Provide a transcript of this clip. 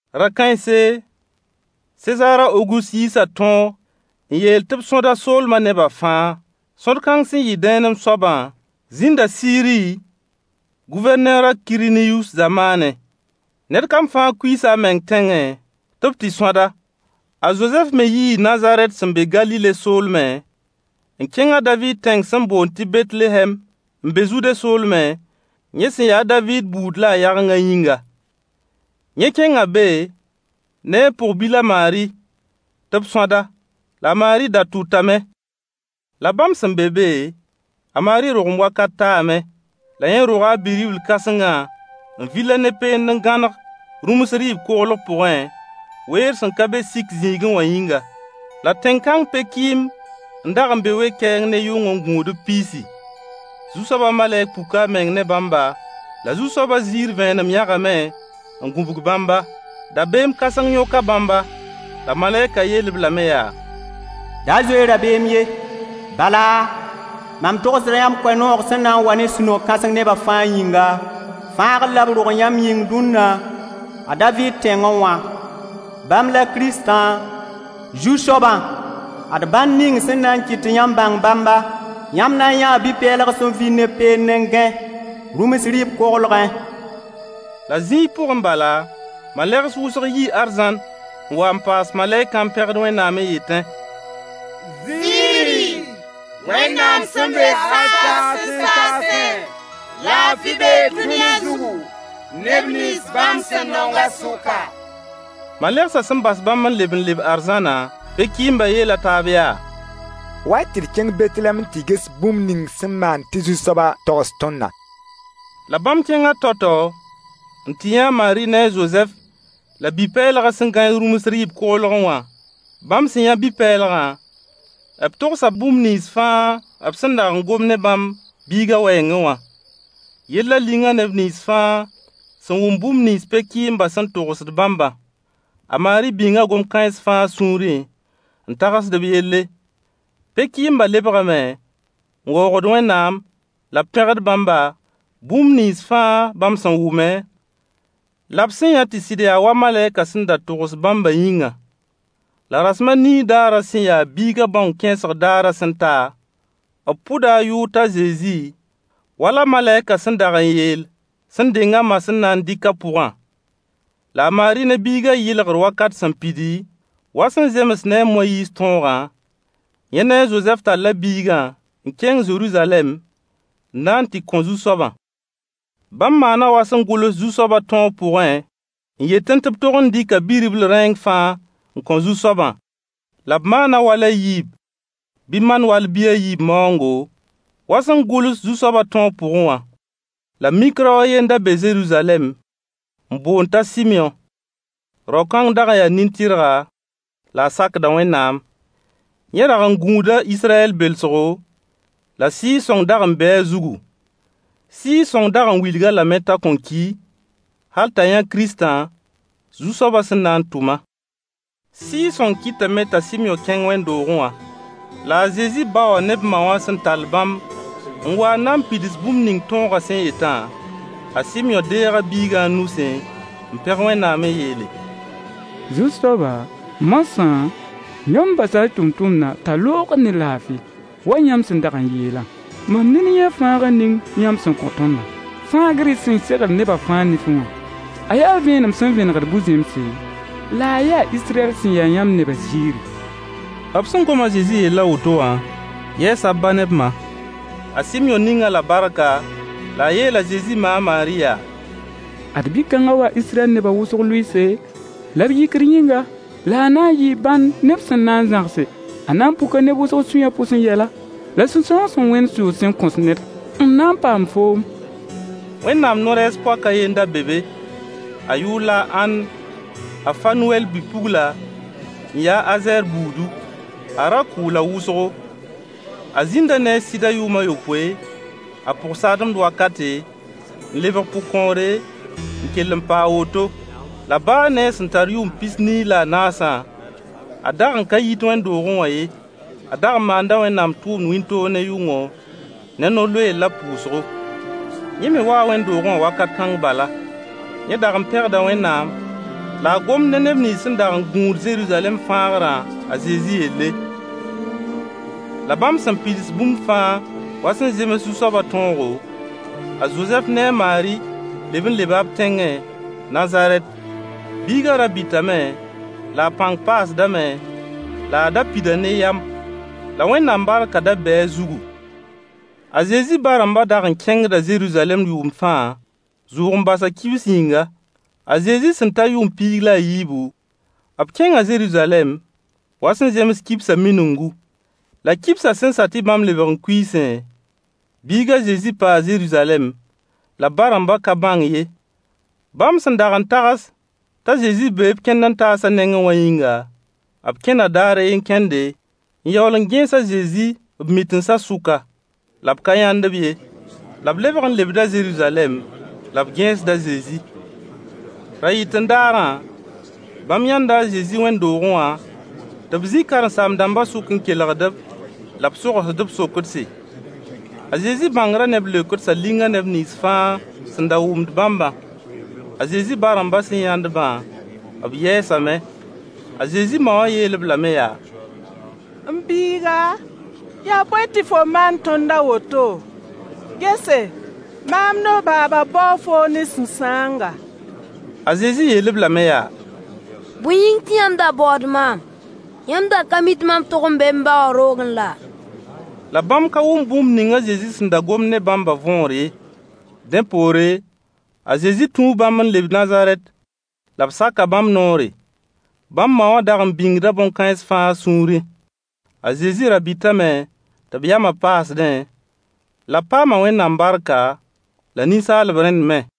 Ra-kãense, Sezaar a Ogust yiisa tõog n yeel tɩ b sõd a soolmã nebã fãa. Sõd-kãng sẽn yɩ dẽenem soabã zĩnda Siiri Gʋvɛrneer a Kiriniyus zamaanẽ. Ned fãa kuiisa a meng tẽngẽ tɩ b tɩ sõd-ba. A Zozɛf me yii Nazarɛt sẽn be Galile soolmẽ n kẽng a Daviid tẽng sẽn boond tɩ Betlehɛm n be Zude soolmẽ, yẽ sẽn ya a Daviid buud la a yagengã yĩnga. Yẽ kẽnga be ne a pʋg-bil a Maari tɩ b sõd-a. La a Maari da tʋtame. La bãmb sẽn be be, a Maari rogem wakat taame. La yẽ roga a bi-ribl kãsengã, n vil-a ne peend n gãneg rũms rɩɩb koglg pʋgẽ, weer sẽn ka be sik-zĩigẽ wã yĩnga. La tẽn-kãng pe-kɩɩmb n dag n be we-kɛɛng ne yʋng n gũud b piisi. Zu-soabã malɛk puka a meng ne bãmba, la Zu-soabã ziir vẽenem yãgame n gũbg bãmba. Dabeem kãseng yõka bãmba. La malɛkã yeel-b lame yaa: Da zoe-y rabeem ye, bala, mam togsda yãmb koe-noog sẽn na n wa ne sũ-no-kãseng nebã fãa yĩnga. Fãagd la b rog yãmb yĩng dũnna, a Daviid tẽngẽ wã. Bãmb la Kiristã, Zu-soabã. Ad bãnd ning sẽn na n kɩt tɩ yãmb bãng bãmba: Yãmb na n yãa bi-pɛɛlg sẽn vil ne peend n gãe rũms rɩɩb koglgẽ. La zĩig pʋgẽ bala, malegs wʋsg yii arzãn n waa n paas malɛkã n pẽgd Wẽnnaam n yetẽ: Ziiri! Wẽnnaam sẽn be hal saasẽ saasẽ! Laafɩ bee dũni zugu, neb nins bãmb sẽn nongã sʋka. Malegsã sẽn bas bãmb n leb n leb arzãna, pe-kɩɩmbã yeela taab yaa: Wa-y tɩ d kẽng Betlehɛm n tɩ ges bũmb ning sẽn maan tɩ Zu-soabã togs tõndã. La bãmb kẽnga tao-tao n tɩ yã a Maari ne a Zozɛf la bi-pɛɛlgã sẽn gãe rũms rɩɩb koglgẽ wã. Bãmb sẽn yã bi-pɛɛlgã, b togsa bũmb nins fãa b sẽn dag n gom ne bãmb biigã wɛɛngẽ wã. Yellã linga neb nins fãa sẽn wʋm bũmb nins pe-kɩɩmbã sẽn togsd bãmbã. A Maari bĩnga gom-kãens fãa a sũurẽ n tagsd b yelle. Pe-kɩɩmbã lebgame, n waoogd Wẽnnaam la b pẽgd bãmba, bũmb nins fãa bãmb sẽn wʋme, la b sẽn yã tɩ sɩd yaa wa malɛkã sẽn da togs bãmbã yĩnga. La rasem a nii daarã sẽn ya biigã bãong kẽesg daarã sẽn ta, b pʋda a yʋʋr t'a Zezi, wala malɛkã sẽn dag n yeel sẽn deng a ma sẽn na n dɩk a pʋgã. La a Maari ne biigã yɩlgr wakat sẽn pidi, wa sẽn zems ne a Moyiis tõogã, yẽ ne a Zozɛf talla biigã n kẽng Zeruzalɛm n na n tɩ kõ Zu-soabã. Bãmb maana wa sẽn gʋls Zu-soabã tõog pʋgẽ n yetẽ tɩ b tog n dɩka bi-ribl rẽeng fãa n kõ Zu-soabã. La b maana wal a yiib bɩ man-wall-bi a yiib maoongo, wa sẽn gʋls Zu-soabã tõog pʋgẽ wã. La mik rao a yen n da be Zeruzalɛm n boond t'a Sɩmyõ. Rao-kãng dag n yaa nin-tɩrga, la a sakda Wẽnnaam. Yẽ dag n gũuda Israyɛl belsgo, la Sɩɩg-sõng dag n bee a zugu. Sɩɩg-sõng dag n wilg-a lame t'a kõn ki, hal t'a yã Kiristã, Zu-soabã sẽn na n tʋmã. Sɩɩg-sõng kɩtame t'a Sɩmyõ kẽng wẽnd-doogẽ wã. La a Zezi ba wã ne b ma wã sẽn tall bãmb n wa n na n pids bũmb ning tõogã sẽn yetã, a Sɩmyõ deega biigã a nusẽ, n pẽg Wẽnnaam n yeele: Zu-soaba! Moasã, yãmb basa y tʋmtʋmdã t'a loogd ne laafɩ. Wa yãmb sẽn dag n yeelã, mam nin yãa fãagr ning yãmb sẽn kõ tõndã, fãagr y sẽn segl neba fãa nifẽ wã. A yaa vẽenem sẽn vẽnegd bu-zẽmse, la a yaa Israyɛl sẽn ya yãmb nebã ziiri. B sẽn gom a Zezi yell a woto wã yɛɛsa b ba ne b ma. A Sɩmyõ ning-b-la barka, la a yeel a Zezi ma a Maari yaa: Ad bi-kãngã waa Israyɛl neb wʋsg lʋɩɩse la b yikr yĩnga, la a na n yɩɩ bãnd neb sẽn na n zãgse. A na n puka neb wʋsg sũy pʋsẽ yɛla, la sũ-sãoong sẽn wẽnd sʋʋg sẽn kõs ned n na n paam foom. Wẽnnaam no-rɛɛs-poak a ye n da be be. A yʋʋr la a Ãnn, a Fanuwɛl bi-pugla, n ya a Azɛɛr buudu. A ra kʋʋla wʋsgo. A zĩnda ne a sɩdã yʋʋm a yopoe a pʋgsademd wakate, n lebg pʋgkõore, n kell n paa a woto. La baa ne a sẽn tar yʋʋm pis-nii la a naasã, a dag n ka yit wẽnd-doogẽ wã ye. A dag n maanda Wẽnnaam tʋʋmd wĩntoog ne yʋngo, ne no-loeer la pʋʋsgo. Yẽ me waa wẽnd-doogẽ wã wakat kãng bala. Yẽ dag n pẽgda Wẽnnaam la a gomd ne neb nins sẽn dag n gũud Zeruzalɛm fãagrã a Zezi yelle. La bãmb sẽn pids bũmb fãa wa sẽn zems Zu-soabã tõogo, a Zozɛf ne a Maari leb n leba b tẽngẽ, Nazarɛt. Biigã ra bɩtame, la a pãng paasdame, la a da pida ne yam, la Wẽnnaam barkã da bee a zugu. A Zezi ba-rãmbã dag n kẽngda Zeruzalɛm yʋʋmd fãa, zʋʋg-n-basã kibs yĩnga. A Zezi sẽn ta yʋʋm piig la a yiibu, b kẽnga Zeruzalɛm wa sẽn zems kibsã miningu. La kibsã sẽn sa tɩ bãmb lebg n kuiisẽ, biig a Zezi paa Zeruzalɛm, la b ba-rãmbã ka bãng ye. Bãmb sẽn dag n tags t'a Zezi bee b kẽnd-n-taasã nengẽ wã yĩnga, b kẽna daar a ye kẽnde, n yaool n gẽes a Zezi b mitinsã sʋka. La b ka yãnd-b ye. La b lebg n lebda Zeruzalɛm la b gẽesd a Zezi. Ra-yɩt-n-daarã, bãmb yãnda a Zezi wẽnd-doogẽ wã tɩ b zĩ karen-saam-dãmbã sʋk n kelgd-b-la b sogsd-b sokdse. A Zezi bãngrã ne b leokdsã linga neb nins fãa sẽn da wʋmd bãmbã. A Zezi ba-rãmbã sẽn yãnd-bã, b yɛɛsame. A Zezi ma wã yeel-b lame yaa: M biiga, yaa bõe tɩ fo maan tõnd a woto? Gese, maam ne f baaba baoo foom ne sũ-sãanga. A Zezi yeel-b lame yaa: Bõe yĩng tɩ yãmb da baood maam? Yãmb da ka mi tɩ mam tog n bee m ba wã roogẽ laa? La bãmb ka wʋm bũmb ning a Zezi sẽn da gomd ne bãmbã võor ye. Dẽ poore, a Zezi tũu bãmb n leb Nazarɛt, la b saka bãmb noore. Bãmb ma wã dag n bĩngda bõn-kãens fãa a sũurẽ. A Zezi ra bɩtame, tɩ b yamã paasdẽ, la b paama Wẽnnaam barka la ninsaalb rẽnd me.